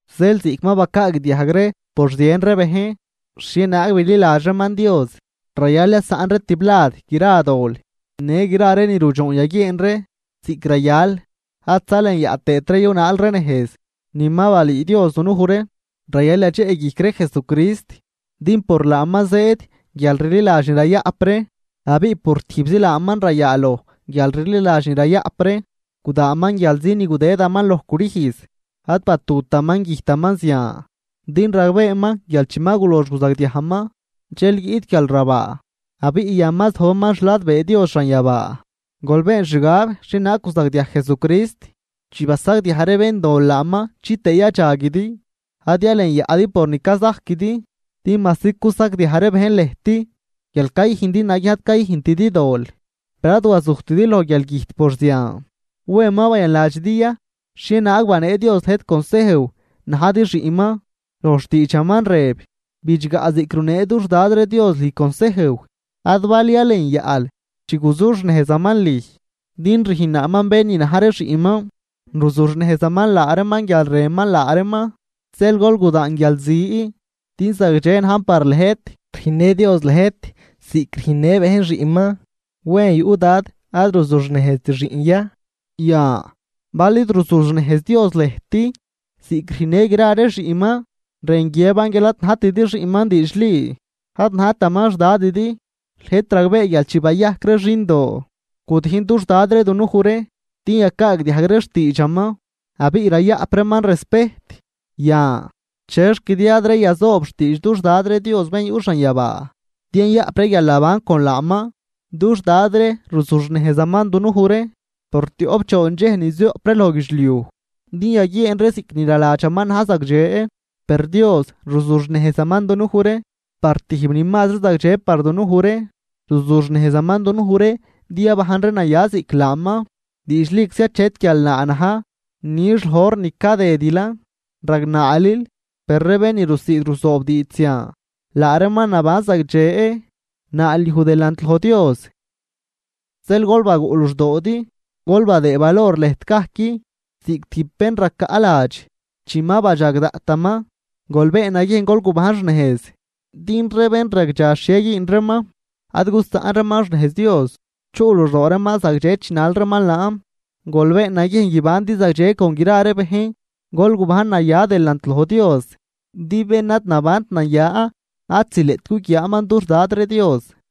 Zeel, ziꞌc ma bacaagdiajg ree por zien ree bejn xhienaag bililadx reeman Dios, rayal yasaꞌn ree tiblad gra dol në gra ree ni rudxoon yaguieen ree ziꞌc rayal, ad zalenyaꞌ tëët ree yunaal ree nejz ni ma balüü Dios dunuj ree. Rayal yadxeꞌguijc ree Jesucrist din por laaman zëëd guialrliladx ni rayaꞌp ree abiꞌ por tijbzi laaman rayaaloj guialrliladx ni rayaꞌp ree. Gudaanman guialzi ni gudëdaman loj crüjz, ad batutaman güjtaman zian din ragbeeman guial chi ma gulox guzagdiajman, dxel guiꞌt guialrabaa. Abiꞌ yan ma zojbaman xladbee Dios xanyabaa. Gol been xgab xhienaag guzagdiaj Jesucrist chi basagdiaj ree béndol laaman, chitëë yadxaguidi, ad yalenyaꞌdi por ni cazajquidi. Din majsi cusagdiaj ree bejn lëjt guial cayüjndi naguiejn ad cayüjntidi dol, per ad wazujtidi loj guialgüjt por zian. ¿Wen ma bayanladxidi ya xhienaag banee Dios lëjt consejw najdi xiꞌnman? Loj xtiidxaman rëb: Xiꞌn, bidxgaꞌ ziꞌc runee dux Dad ree Dios lüj consejw, ad bal yalenyaꞌl chi guzuxnejzaman lüj. Din rüjnnaaman bén ni na̱j ree xiꞌnman, ruzuxnejzaman laa reeman guial rënman laa reeman. Zeel gol gudaan guialzi, din zagdxe najn par lëjt. Rüjnnë Dios lëjt ziꞌc rüjnnë bejn xiꞌnman, ¿wen yuꞌ dad ad ruzuxnejzt xiꞌn ya? Yan bal id ruzuxnejz Dios lëjt ziꞌc rüjnnë gra ree xiꞌnman, rën guiëban guial ad najtidi xiꞌnman diidxli, ad najtaman xDadidi. Lëjt ragbee guial chi bayajc ree xindoo, gudijn dux dad ree dunuj ree din yacaagdiajg ree xtiidxaman abiꞌ rayaꞌp reeman respejt. Yan, ¿chexc di ad ree yazoob xtiidx dux Dad ree Dios bén yuꞌ xanyabaa, din yayaꞌp ree guialnaban con laaman? Dux dad ree ruzuxnejzaman dunuj ree por tioꞌp choon dxej ni zioꞌp ree loj guidxliuj din yaguieen ree ziꞌc ni naladxaman na̱j zagdxe. Per Dios ruzuxnejzaman dunuj ree par tijb ni mazri zagdxe par dunuj ree, ruzuxnejzaman dunuj ree din yabajn ree naya ziꞌc laaman. Diidxliczi achet guialnaa na̱j nix loj hor ni cadëdilan, ragnaalil. Per ree bén ni rusiid ruzoob diidx zian, laa reeman naban zagdxe, naalyuj delant loj Dios. Zeel gol baguꞌ luxdoodi, gol badëëd valor lëjt gajc ziꞌc tijb bén racaꞌladx chi ma badxag daꞌtaman. Gol been naguiejn gol gubajn xnejz, din ree bén ragdxa xhie güün reeman, ad gusaꞌn reeman xnejz Dios, chuꞌ luxdoo reeman zagdxe chinal reeman laan. Gol been naguiejn guibandi zagdxe con gra ree bejn, gol gubajn naya delant loj Dios din bén ad nabant naya ad zileꞌt guguiaaman dux Dad ree Dios.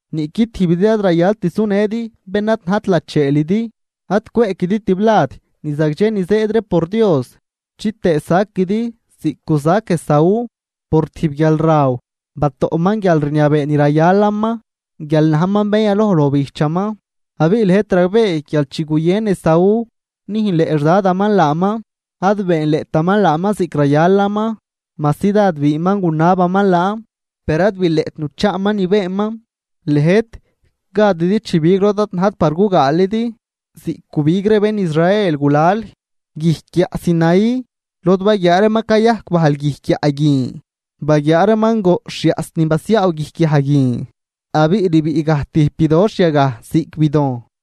Niꞌqui tijbidi ad rayalt sunëdi bén ad najt lacheelidi, ad cweꞌquidi tiblad ni zagdxe ni zëëd ree por Dios chitëë saquidi ziꞌc guzac Esaú, por tijb guialraw batoꞌman guialrniabee ni rayalaman guial najman bén yaloj loj bijchaman. Abiꞌ lëjt ragbee guial chi guyën Esaú nüjnleꞌ xdadaman laaman ad beenleꞌtaman laaman ziꞌc rayalaman. Majsi dád biinman gunabaman laan, per ad bileꞌt nuchaaman ni beenman. Lëjt gadidi chibig lod ad najt par gugaalidi ziꞌc gubig ree bén Israel gulal guijc guiaꞌ Sinaí lod baguiaa reeman cayajc bajl guijc guiaꞌ guin, baguiaa reeman goꞌxh yaꞌs ni basiaaw guijc guiaꞌ guin abiꞌ rbiꞌ gaj tijb bidoxh yagaj ziꞌc bidojn.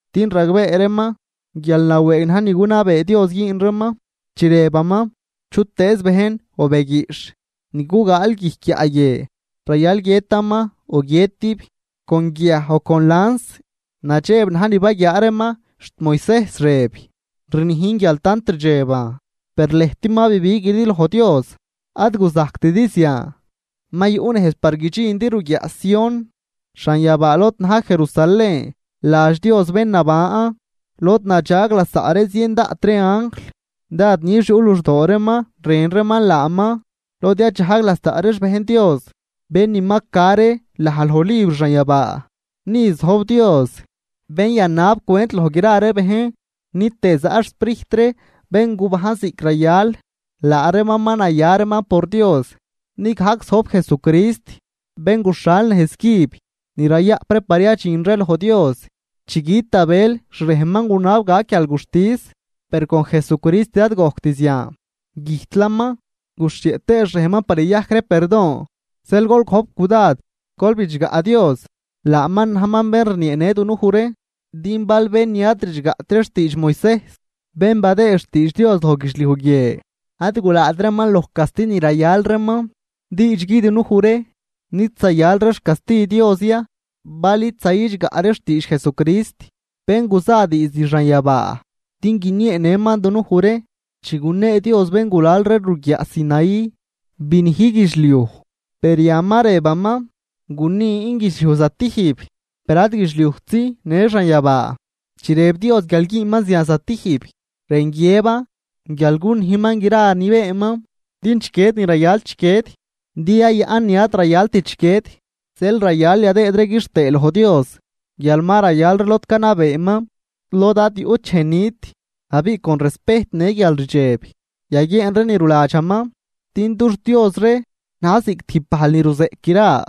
Din ragbee reeman guial nawëëg na̱j ni gunabee Dios güün reeman chi rëbaman: “Chutëëz bejn o be guiꞌxh ni gugaal guijc guiaꞌ guie rayal guiëtaman o guiëtib con guiaj o con lans.” Nadxeb na̱j ni baguiaa reeman xt Moisejs rëb: “Rnijn guial tant rdxeban.” Per lëjt ma bibiguidi loj Dios, ad guzajctidi zian. Ma yuꞌ nejz par guidxindi ruguiaꞌ Sión, xanyabaa lod na̱j Jerusalén ladx Dios bén naban, lod nadxag lasaꞌ ree zien daꞌt ree anjl, dád nix yuꞌ luxdoo reeman rën reeman laaman lod yadxajg lasaꞌ ree xbejn Dios bén ni ma ca ree laj loj libr xanyabaa. Ni zojb Dios, bén yanab cwent loj gra bejn, ni tëë zaꞌ xSprijt ree bén guban ziꞌc rayal laa reeman ma naya reeman por Dios. Ni gajc zojb Jesucrist, bén guxhal nejz cüb ni rayaꞌp ree par yadxin ree loj Dios. Chi güt Abel xrejnman gunab gac guialguxtis, per con Jesucrist ad gojct zian, güjtlaman, guxhieꞌ tëë xrejnman par yayajc ree perdon. Zeel gol gojp cudad gol bidxgaꞌ Dios, laaman najman bén rnieenë dunuj ree. Din bal bén ni ad bidxgaꞌt ree xtiidx Moisejs bén badëëd xtiidx Dios loj guidxliuj guie ad gulaat reeman loj casti ni rayal reeman, diidxgui dunuj ree nid zayal ree xcasti Dios ya bal id zayidxgaꞌ ree xtiidx Jesucrist, bén guza diizd xanyabaa din guinieenëman dunuj ree. Chi gunee Dios béngulal ree ruguiaꞌ Sinaí, binij guidxliuj. Per yan ma rëbaman: “Gunin guidxliuj zatijb, per ad guidxliujtzi, në xanyabaa.” Chi rëb Dios guial güünman zian zatijb, rën guiëban guial gunijman gra ni beenman, din chiquied ni rayal chiquied din yayaꞌn ni ad rayalt chiquied. Zeel rayal yadëëd ree quixtëë loj Dios guial ma rayal ree lod canabeeman, lod ad yuꞌt dxej nit, abiꞌ con respejt në guialrdxeb yaguieen ree ni ruladxaman. Din dux Dios ree na̱j ziꞌc tijb bajl ni ruzeꞌc gra.